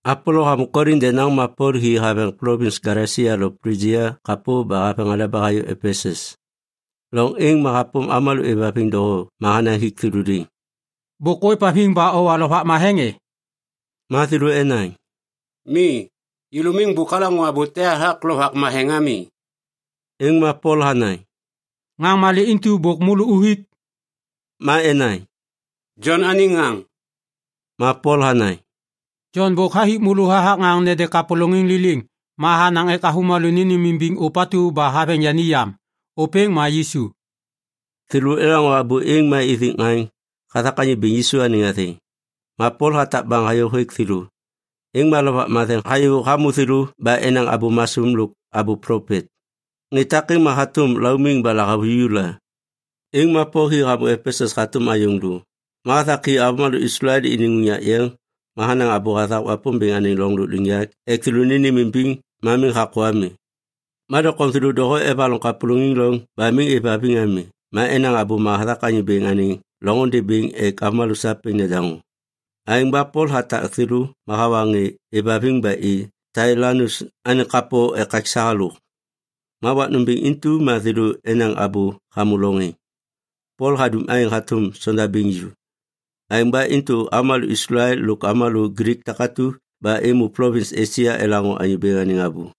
Apolo hamô Kolin denaŋ ma Pol hi haveŋ plovins Galesia lo Plijia kapô ba haveŋ aleba hayô Epesus. Loŋ êŋ ma hapôm avômalô êvhaviŋ doho ma hanaŋ hik thêlô liŋ, “Bôk ôêvhaviŋ ba owa Lovak Matheŋ e?” Ma thêlô enaŋ, “Mi, yêlô miŋ bôk alaŋô abô te hathak Lovak Matheŋ ami.” Êŋ ma Pol hanaŋ, “Ŋaŋ malê intu bôk môlô uthik?” Ma enaŋ, “Jon anêŋ ŋaŋ.” Ma Pol hanaŋ, “Jon bôk hathik avômalô hathak ŋaŋ nede kapôlôŋiŋ liliŋ ma hanaŋ ek avômalô nênêmimbiŋ ôpatu ba haveŋ yani yam. Ôpêŋ ma Yisu.” Thêlô elaŋô abô êŋ, ma ithik ŋaŋ hathak Anyô Bêŋ Yisu anêŋ athêŋ. Ma Pol hatak baŋ hayô hêk thêlô, êŋ ma Lovak Matheŋ hayô hamô thêlô ba enaŋ abô masôm lôk abô plopet. Ŋê takêŋ ma hatôm laumiŋ ba lahavuju la. Êŋ ma Pol hi hamô Epesus hatôm ayôŋ lô. Ma hathak hi avômalô Islael iniŋ unyak yeŋ ma hanaŋ abô hathak Wapômbêŋ anêŋ loŋ lôkliŋyak ek thêlô nênêmimbiŋ ma miŋ hakô ami. Ma doŋtom thêlô doho evaloŋ kapôlôŋiŋ loŋ ba miŋ êvhaviŋ ami ma enaŋ abôma hathak Anyô Bêŋ anêŋ loŋôndê bêŋ ek avômalô sapêŋ nedaŋô. Aêŋ ba Pol hatak thêlô ma hawa ŋê êvhaviŋ ba i Tailanus anêŋ kapo ekaksa halôk. Ma wak nômbêŋ intu ma thêlô enaŋ abô hamô loŋ êŋ. Pol hadum aêŋ hatôm sondabêŋ ju. Aêŋ ba intu avômalô Islael lôk avômalô Glik takatu ba êmô plovins Esia elaŋô Anyô Bêŋ anêŋ abô.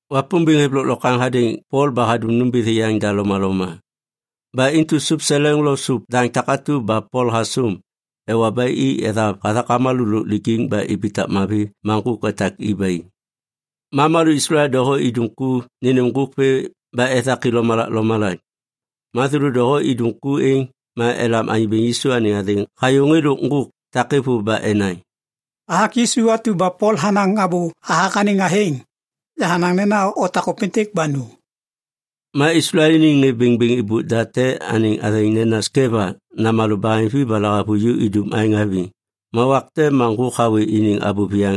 Wapômbêŋ hêv lôklokwaŋ hadêŋ Pol ba hadum nômbithi yaŋda lomaloma. Ba intu sôp seleŋ lo sôp daŋ takatu ba Pol hasôm, ewa ba i ethav hathak avômalô lôk lijiŋ ba ibitak mavi ma ŋgôk etak i ba i. Ma avômalô Islael doho idum ku nênêm ŋgôk vê ba ethak i lomalak lomalak. Ma thêlô doho idum ku êŋ, ma elam Anyô Bêŋ Yisu anêŋ athêŋ hayô ŋê lôk ŋgôk takêŋ vôv ba enaŋ, “Hathak Yisu atu ba Pol hanaŋ abô hathak anêŋ athêŋ, yahanaŋ nena otak ôpêntêk ba nu.” Ma Islael iniŋ ŋê bêŋbêŋ êbôk da te anêŋ athêŋ nena Skeva namalô baheŋvi ba lahavuju idum aêŋ haviŋ. Ma wak te ma ŋgôk hawê iniŋ abô viyaŋ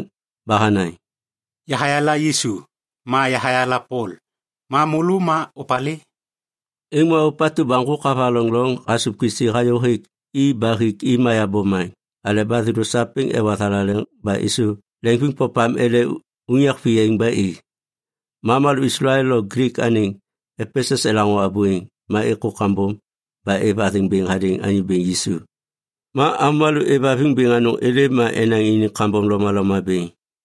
ba hanaŋ, “Yahayala Yisu, ma yahayala Pol, ma môlô ma opalê?” Êŋ ma ôpatu ba ŋgôk havaloŋ loŋ hasôv kisi hayô hêk i ba hik i mayav bomaŋ aleba thêlô sapêŋ ewa thalaleŋ ba êsôv leŋviŋpopam ele unyak viyaiŋ ba i. Ma avômalô Islael lo Glik anêŋ Epesus elaŋô abô êŋ, ma êkô kambom ba êv athêŋ bêŋ hadêŋ Anyô Bêŋ Yisu. Ma avômalô êvhaviŋ bêŋ anôŋ êlêm ma enaŋ iniŋ kambom lomaloma bêŋ.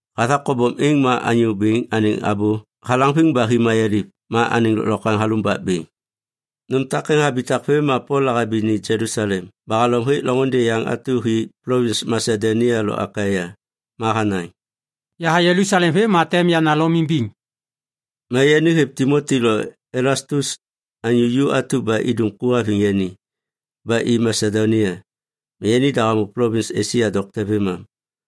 Hathak kobom êŋ ma Anyô Bêŋ anêŋ abô halaŋviŋ ba hi mayaliv ma anêŋ lôklokwaŋ halumbak bêŋ. Nôm takêŋ habitak vêm ma Pol lahabi ni Jelusalem ba halom hêk loŋôndê yaŋ atu hi plovins Masedonia lo Akaia. Ma hanaŋ, “Yaha Jelusalem vêm ma tem yana Lom imbiŋ.” Ma yani hêv Timoti lo Elastus, anyô ju atu ba idum ku haviŋ yani, ba i Masedonia. Ma yanida hamô plovins Esia dokte vêmam.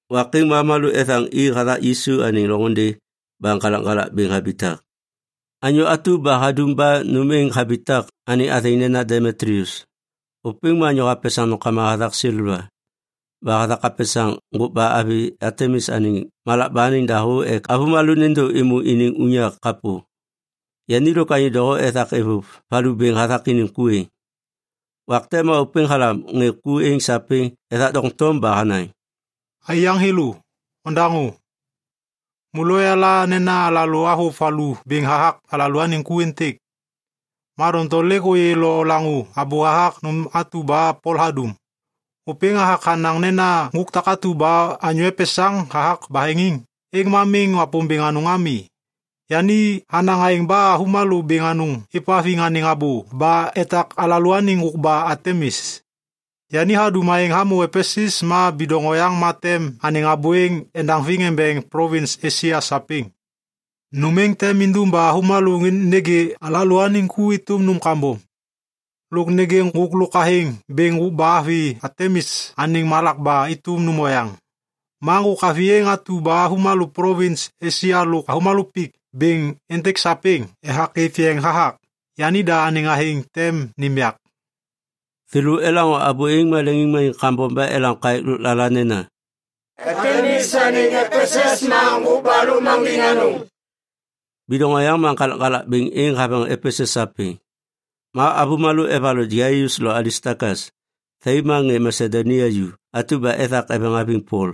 Wak êŋ ma avômalô ethaŋ i hathak Yisu anêŋ loŋôndê ba ŋgalakŋgalak bêŋ habitak. Anyô atu ba hadum ba nôm êŋ habitak anêŋ athêŋ nena Demitlius. Ôpêŋ ma anyô hapesaŋ nômkama hathak seleva. Ba hathak hapesaŋ ŋgôkba avi Atemis anêŋ malakba anêŋ dahô ek avômalô nêndô êmô iniŋ unyak kapô. Yani lôk anyô doho ethak êvôv valu bêŋ hathak iniŋ ku êŋ. Wak te ma ôpêŋ halam ŋê ku êŋ sapêŋ ethak doŋtom ba hanaŋ, “Aiyaŋ thêlô, odaŋô. Môlô oyala nena alalô avôv valu bêŋ hathak alalôaniŋ ku êntêk. Ma doŋtom lêk ôyê lo olaŋô abô hathak nôm atu ba Pol hadum. Ôpêŋ hathak hanaŋ nena ŋgôk takatu ba anyô epesaŋ hathak baheŋiŋ, êŋ ma miŋ wapômbêŋ anôŋ ami. Yani hanaŋ aêŋ ba avômalô bêŋ anôŋ êvhaviŋ anêŋ abô ba etak alalôaniŋ ŋgôkba Atemis. Yani hadum aêŋ hamô Epesus ma bidoŋ oyaŋ ma tem anêŋ abô êŋ endaŋviŋ embeŋ plovins Esia sapêŋ. Nôm êŋ tem indum ba avômalô nêgê alalôaniŋ ku êtôm nôm kambom. Lôk nêgê ŋgôk lôk athêŋ bêŋ ŋgôkba avi Atemis anêŋ malakba êtôm nôm oyaŋ. Ma ŋgôk avi êŋ atu ba avômalô plovins Esia lôk avômalô pik bêŋ êntêk sapêŋ ethak êv yeŋ hathak, yanida anêŋ athêŋ tem nêm yak.” Thêlô elaŋô abô êŋ ma leŋiŋmaniŋ kambom ba elam kaêk lôklala nena, “Atemis anêŋ Epesus ma ŋgôkba lôkmaŋgiŋ anôŋ!” Bidoŋ oyaŋ ma ŋgalakŋgalak bêŋ êŋ haveŋ Epesus sapêŋ. Ma avômalô evaloŋ Gaius lo Alistakas, thai ma ŋê Masedonia ju atu ba ethak eveŋ haviŋ Pol,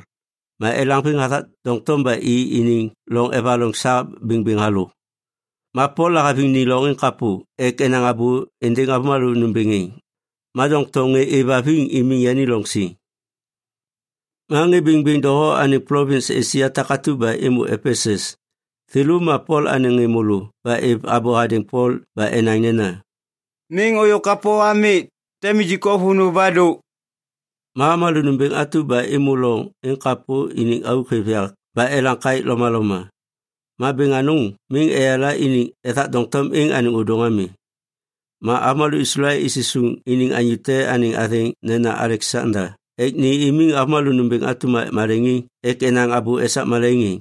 ma elaŋviŋ hathak doŋtom ba i iniŋ loŋ evaloŋ sa bêŋbêŋ halôk. Ma Pol lahaviŋ ni loŋ êŋ kapô ek enaŋ abô êndêŋ avômalô nômbêŋ êŋ, ma doŋtom ŋê êvhaviŋ imiŋ yani loŋ siŋ. Ma ŋê bêŋbêŋ doho anêŋ plovins Esia takatu ba êmô Epesus, thêlô ma Pol anêŋ ŋê môlô ba êv abô hadêŋ Pol ba enaŋ nena, “Miŋ ôyô kapô ami. Tem nijik o vônô ba dô.” Ma avômalô nômbêŋ atu ba êmô loŋ êŋ kapô iniŋ auk hêv yak ba elam kaêk lomaloma. Ma bêŋ anôŋ miŋ eyala iniŋ ethak doŋtom êŋ anêŋ ôdôŋ ami. Ma avômalô Islael isisuŋ iniŋ anyô te anêŋ athêŋ nena Aleksanda ek ni imiŋ avômalô nômbêŋ atu maleŋiŋ ek enaŋ abô esak malaiŋ êŋ.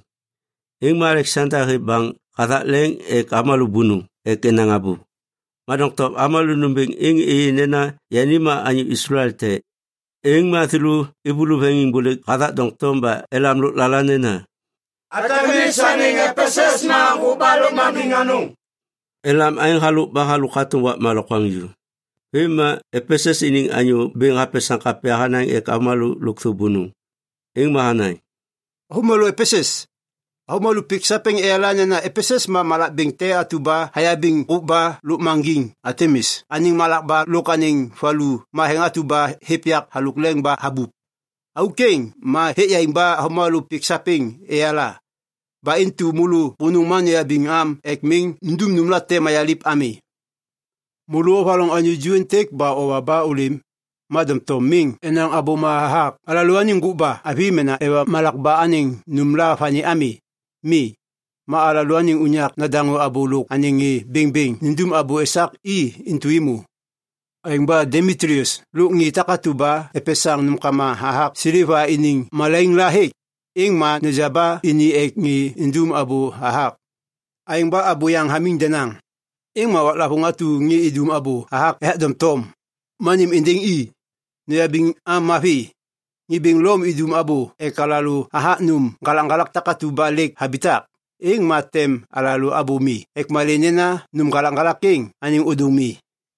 Êŋ ma Aleksanda hêv baŋ hathak leŋ ek avômalô bônôŋ ek enaŋ abô. Ma doŋtom avômalô nômbêŋ êŋ êyê nena yani ma anyô Islael te, êŋ ma thêlô êvôlô veŋiŋbôlêk hathak doŋtom ba elam lôklala nena, “Atemis anêŋ Epesus ma ŋgôkba lôkmaŋgiŋ anôŋ!” Elam aêŋ halôk ba halôk hatôm wakma lokwaŋju. Vêm ma Epesus iniŋ anyô bêŋ hapesaŋ kapya hanaŋ ek avômalô lôkthô bônôŋ. Êŋ ma hanaŋ, “Avômalô Epesus, avômalô pik sapêŋ eyala nena Epesus ma malak bêŋ atu ba hayabiŋ ŋgôkba lôkmaŋgiŋ Atemis anêŋ malakba lôk anêŋ valu matheŋ atu ba hêv yak halôk leŋ ba habup. Auk êŋ ma hêk yaiŋ ba avômalô pik sapêŋ eyala. Ba intu môlô bônôŋ ma noyabiŋ am ek miŋ nundum nômlate mayaliv ami. Môlô ovaloŋ anyô ju êntêk ba owa ba ôlêm, ma doŋtom miŋ enaŋ abôma hathak alalôaniŋ ŋgôkba avi mena ewa malakba anêŋ nômla vani ami. Mi. Ma alalôaniŋ unyak nedaŋô abô lôk anêŋ ŋê bêŋbêŋ nindum abô esak i intu êmô. Aêŋ ba Demitlius lôk ŋê takatu ba epesaŋ nômkama hathak seleva iniŋ malaiŋ la hêk, êŋ ma neja ba ini ek ŋê idum abô hathak. Aêŋ ba abô yaŋ hamiŋ denaŋ, êŋ ma waklavôŋ atu ŋê idum abô hathak ethak doŋtom, ma nêm êndêŋ i. Noyabiŋ am mavi. Ŋê bêŋ Lom idum abô ek alalô hathak nôm ŋgalakŋgalak takatu ba lêk habitak, êŋ ma tem alalô abô mi ek malê nena nôm ŋgalakŋgalak êŋ anêŋ ôdôŋ mi.”